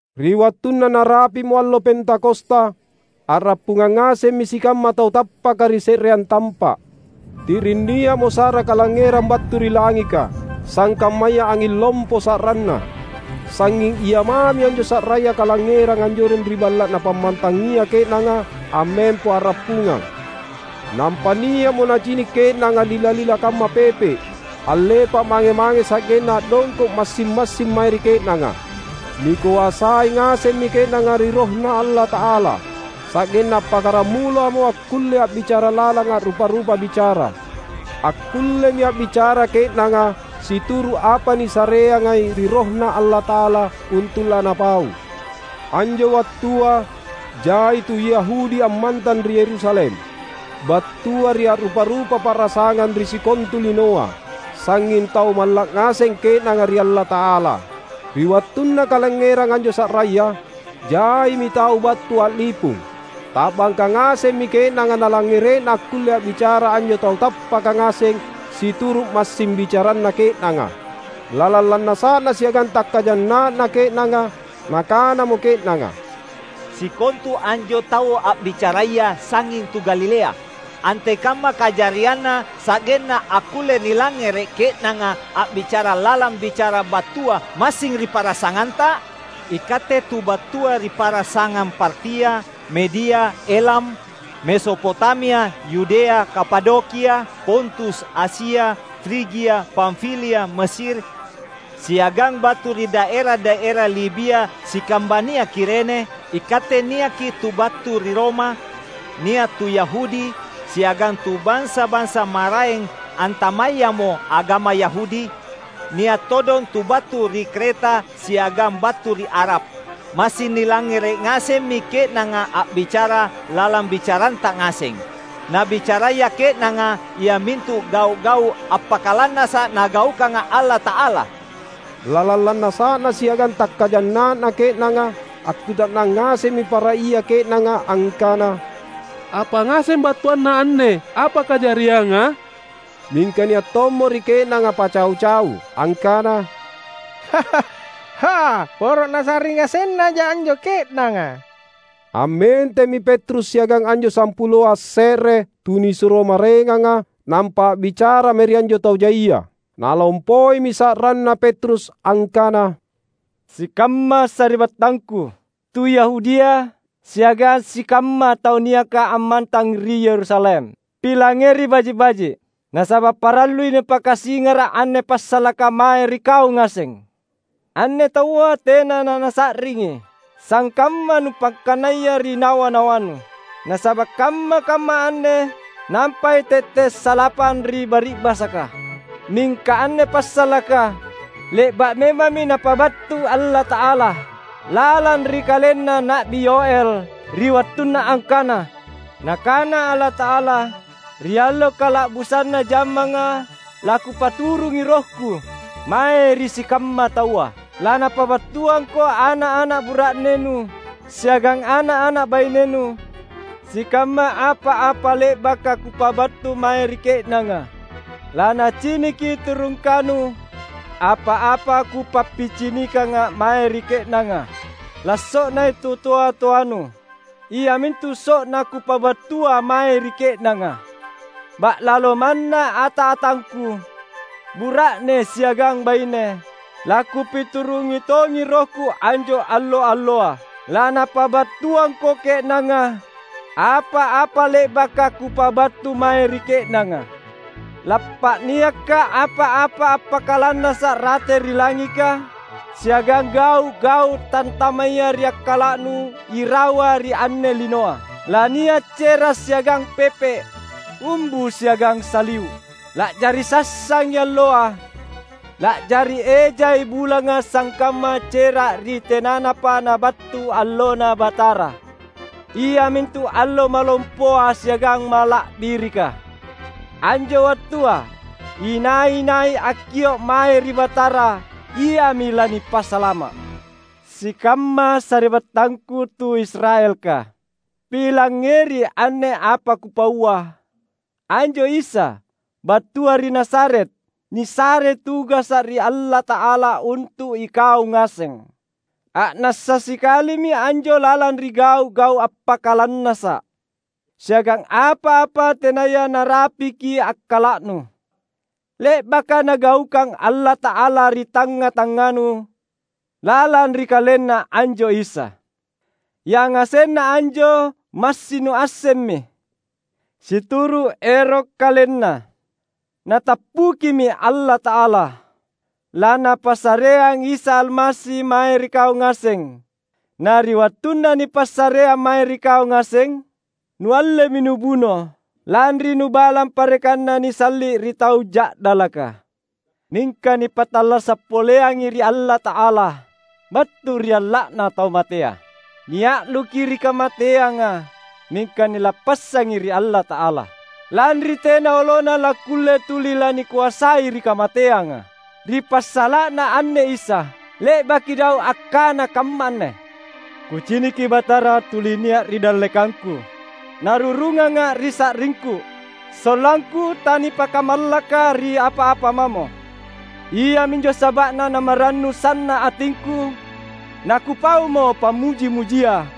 Ri wattunna narapi’mo allo Pentakosta, a’rappungang ngasemmi sikamma tau tappaka ri se’reang tampa’. Ti’ring nia’mo sa’ra kalangngerang battu ri langika, sangkammaya anging lompo sa’ranna. Sangnging ia mami anjo sa’raya kalangngerang anjoreng ri balla’ napammantangia ke’nanga ammempo a’rappungang. Nampa nia’mo nacini’ ke’nanga lila-lila kamma pepe’, allepa’ mange-mange sa’genna a’dongko’ massing-massing mae ri ke’nanga. Nikoasai ngasemmi ke’nanga ri RohNa Allata’ala, sa’genna appakkaramulamo akkulle a’bicara lalang a’rupa-rupa bicara. Akkullemi a’bicara ke’nanga situru’ apa nisareangai ri RohNa Allata’ala untu’ lanapau. Anjo wattua jai tu Yahudi ammantang ri Yerusalem, battua ri a’rupa-rupa pa’rasangang ri sikontu linoa. Sangnging tau malla’ ngaseng ke’nanga ri Allata’ala. Ri wattunna kalangngerang anjo sa’raya, jaimi tau battu a’lipung. Ta’bangka ngasemmi ke’nanga nalangngere’na akkulle a’bicara anjo tau tappaka ngaseng situru’ massing bicaranna ke’nanga. Lalang lannasa’na siagang takkajanna’na ke’nanga, nakanamo ke’nanga, "Sikontu anjo tau a’bicaraya sangnging tu Galilea! Antekamma kajarianna, sa’genna akkulle nilangngere’ ke’nanga a’bicara lalang bicara battua massing ri pa’rasanganta? Ikatte tu battua ri pa’rasangang Partia, Media, Elam; Mesopotamia, Yudea, Kapadokia, Pontus, Asia, Frigia, Pamfilia, Mesir, siagang battu ri daera-daera Libia sikambania Kirene; ikatte niakki’ tu battu ri Roma, nia’ tu Yahudi, siagang tu bansa-bansa maraeng antamayamo agama Yahudi; nia’ todong tu battu ri Kreta siagang battu ri Arab. Massing nilangngere’ ngasemmi ke’nanga a’bicara lalang bicaranta ngaseng; nabicaraya ke’nanga iamintu gau’-gau’ appakalannasa’ Nagaukanga Allata’ala!" Lalang lannasa’na siagang takkajanna’na ke’nanga, akkuta’nang ngasemmi para ia ke’nanga angkana, "Apa ngaseng battuanna anne apa kajarianga?" Mingka nia’ tommo ri ke’nanga pacau-cau, angkana, "Hah, poro nasa’ring ngasennaja anjo ke’nanga!" Ammentemmi Petrus siagang anjo sampuloa asse’re tunisuro maraenganga, nampa a’bicara mae ri anjo tau jaia. Nalompoimi sa’ranna Petrus angkana, "Sikamma sari’battangku, tu Yahudia siagang sikamma tau niaka ammantang ri Yerusalem! Pilangngeri baji’-baji’, nasaba’ parallui nipakasingara’ anne passalaka mae ri kau ngaseng. Anne taua tena nanasa’ringi sangkamma nupakkanaya ri nawa-nawannu, nasaba’ kamma-kamma anne nampai tette’ salapang ri bari’basaka. Mingka anne passalaka, le’ba’ memammi Napabattu Allata’ala lalang ri kalenna Na’bi Yoël, ri wattunna angkana: Nakana Allata’ala, ‘Ri allo kala’busanna jammanga laKupaturungi RohKu mae ri sikamma taua. Lanapabattuangko ana’-ana’ bura’nenu siagang ana’-ana’ bainenu sikamma apa-apa le’baka Kupabattu mae ri ke’nanga. Lanaciniki tu rungkanu apa-apa Kupappicinikanga mae ri ke’nanga. Lasso’nai tu toa-toanu, iamintu so’na Kupabattua mae ri ke’nanga. Ba’lalo manna ata-atangKu — bura’ne siagang baine — laKupiturungi tongi RohKu anjo allo-alloa. Lanapabattuangko ke’nanga, apa-apa le’baka Kupabattu mae ri ke’nanga. Lappa’niakKa’ apa-apa appakalannasa’ rate ri langika, siagang gau’-gau’ tantamaya ri akkala’nu irawa ri anne linoa; lania’ cera’ siagang pepe’, umbu siagang saliu’. La’jari sassangi alloa, la’jari ejai bulanga sangkamma cera’ ri tenanapa nabattu AllonNa Batara, iamintu allo malompoa siagang mala’birika. Anjo wattua, inai-nai akkio’ mae ri Batara iami lanipasalama’.’ Sikamma sari’battangku tu Israelka! Pilangngeri anne apa kupaua: Anjo Isa, battua ri Nazaret, nisarei tugasa’ ri Allata’ala untu’ ikau ngaseng. A’nassa sikalimi anjo lalang ri gau’-gau’ appakalannasa’ siagang apa-apa tenaya narapiki akkala’nu, le’baka Nagaukang Allata’ala ri tangnga-tangnganu lalang ri KalenNa anjo Isa. Yangasenna anjo massing nuassemmi. Situru’ ero’ KalenNa, Natappukimi Allata’ala laNapassareang Isa Almasi mae ri kau ngaseng. Na ri wattunna nipassareang mae ri kau ngaseng, nuallemi nubuno, lanri nubalang parekanna nisalli’ ri tau ja’dalaka. Mingka nipattallasa’ poleangi ri Allata’ala battu ri alla’na tau matea. Nia’luki ri kamateanga, mingka nilappassangi ri Allata’ala, lanri tena olona lakkulle tuli lanikoasai ri kamateanga. Ri passala’na anne Isa, le’baki Daud akkana kamma anne, ‘Kuciniki Batara tuli nia’ ri dallekangku; Narurunganga’ ri sa’ringku, sollangku tanipakamallaka ri apa-apa mamo. Iaminjo saba’na namarannu sanna’ atingku nakupaumo pammuji-mujia;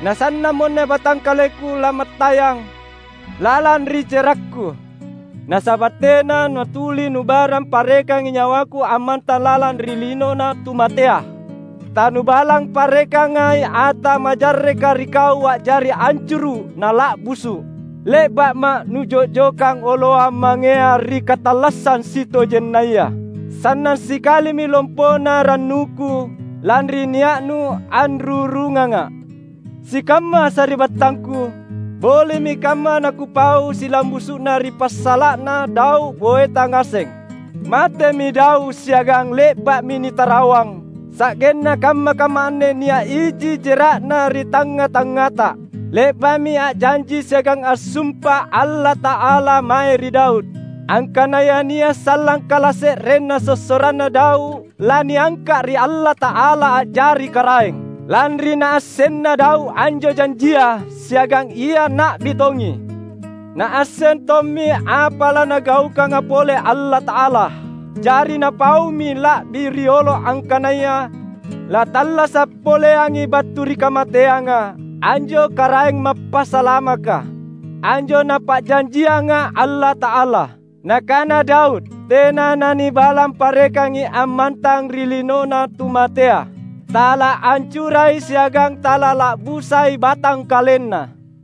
na sannammonne batangkalengku lamattayang lalang ri jerakku. Nasaba’ tena natuli nubalang parekangi nyawaku ammantang lalang ri linona tu matea. Tanubalang parekangai ata majarreka ri kau a’jari ancuru’ na la’busu’. Le’ba’ma’ Nujo’jokang oloang mangea ri katallassang sitojennaya. Sanna’ sikalimi lompona rannuku, lanri nia’Nu anrurunganga’.’ Sikamma sari’battangku, boli’mi kamma nakupau silambusu’na ri passala’na Daud boeta ngaseng. Matemi Daud siagang le’ba’mi nitarawang; sa’genna kamma-kamma anne nia’ iji jera’na ri tangnga-tangngata. Le’ba’mi a’janji siagang assumpa Allata’ala mae ri Daud, angkanaya nia’ sallang kalase’renna sossoranna Daud laniangka’ ri Allata’ala a’jari karaeng. Lanri naassenna Daud anjo janjia, siagang ia na’bi tongi, naasseng tommi apa laNagaukanga pole Allata’ala. Jari napaumi la’bi riolo angkanaya lattallasa’ poleangi battu ri kamateanga anjo Karaeng Mappasalamaka, anjo Napa’janjianga Allata’ala. Nakana Daud, ‘Tena nanibalang parekangi ammantang ri linona tu matea; talaancurai siagang talala’busai BatangkalenNa.’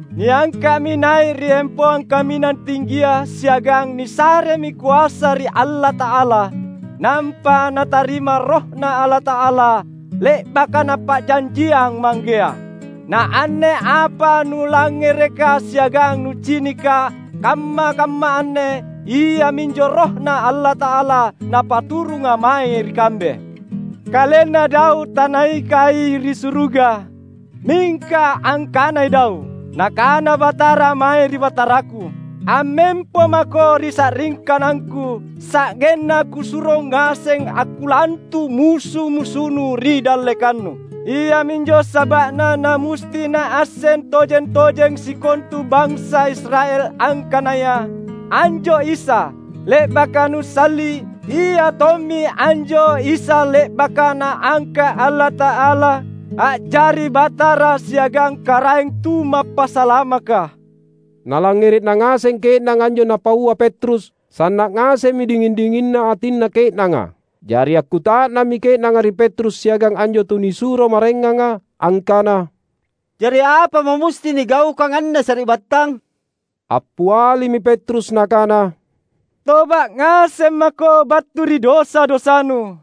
Niangka’mi nai’ ri empoang kaminang tinggia siagang nisaremi koasa ri Allata’ala, nampa Natarima RohNa Allata’ala, le’baka Napa’janjiang Manggea. Na anne apa nulangngereka siagang nucinika kamma-kamma anne iaminjo RohNa Allata’ala, Napaturunga mae ri kambe. Kalenna Daud tanaikai ri suruga, mingka angkanai Daud, ‘Nakana Batara mae ri Bataraku: Ammempo maKo ri sa’ri kanangKu, sa’genna Kusuro ngaseng akkulantu’ musu-musunNu ri dallekanNu!’ Iaminjo saba’na namusti naasseng tojeng-tojeng sikontu bansa Israel angkanaya anjo Isa, le’baka nusalli’, Iatommi anjo Isa le’baka Naangka’ Allata’ala a’jari Batara siagang Karaeng Tumappasalamaka!" Nalangngere’na ngaseng ke’nanga anjo napaua Petrus, sanna’ ngasemmi dinging-dinginna atinna ke’nanga. Jari akkuta’nammi ke’nanga ri Petrus siagang anjo tunisuro maraenganga, angkana, "Jari apamo musti nigaukang anne, sari’battang?" Appialimi Petrus nakana, "Toba’ ngaseng mako battu ri dosa-dosanu.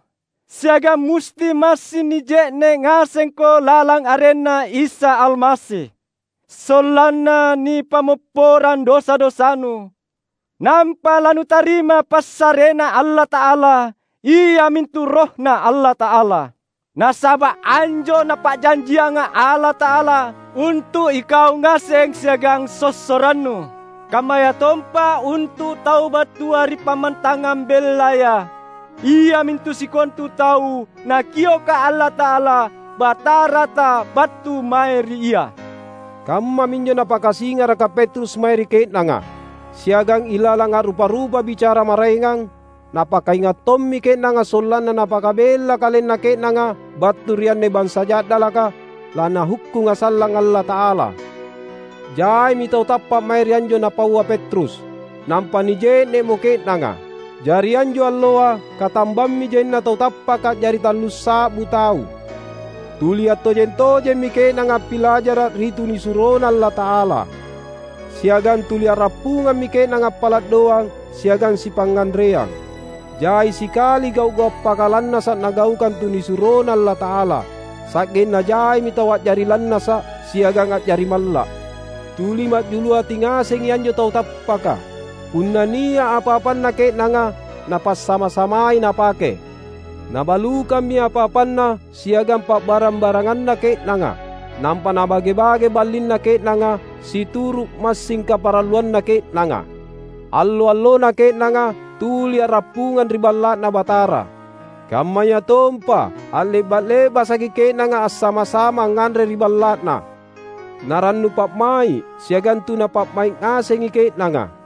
Siagang musti massing nije’ne’ ngasengko lalang arenNa Isa Almasi, sollanna nipammopporang dosa-dosanu. Nampa lanutarima passareNa Allata’ala, iamintu RohNa Allata’ala. Nasaba’ anjo Napa’janjianga Allata’ala untu’ ikau ngaseng siagang sossorannu, kammayatompa untu’ tau battua ri pammantangang bellaya — iamintu sikontu tau Nakioka Allata’ala Batarata battu mae ri Ia." Kammaminjo napakasingaraka Petrus mae ri ke’nanga. Siagang ilalang a’rupa-rupa bicara maraengang, napakainga’ tommi ke’nanga sollanna napakabella kalenna ke’nanga battu ri anne bansa ja’dalaka laNahukkunga sallang Allata’ala. Jaimi tau tappa’ mae ri anjo napaua Petrus, nampa nije’ne’mo ke’nanga. Jari anjo alloa katambammi jaina tau tappaka a’jari tallussa’bu tau. Tuli attojeng-tojemmi ke’nanga appilajara’ ri tunisuroNa Allata’ala. Siagang tuli a’rappungammi ke’nanga appala’ doang siagang sipangnganreang. Jai sikali gau’-gau’ appakalannasa’ nagaukang tunisuroNa Allata’ala. Sa’genna jaimi tau a’jari lannasa’ siagang a’jari malla’. Tuli ma’julu ati ngasengi anjo tau tappaka. Punna nia’ apa-apanna ke’nanga, napassama-samai napake. Nabalukammi apa-apanna siagang pa’barang-baranganna ke’nanga, nampa nabage-bage ballinna ke’nanga situru’ massing kaparalluanna ke’nanga. Allo-allona ke’nanga tuli a’rappungang ri Balla’Na Batara; kammayatompa a’le’ba’-le’basaki ke’nanga assama-sama angnganre ri balla’na. Na rannu pa’mai’ siagang tuna pa’mai’ ngasengi ke’nanga.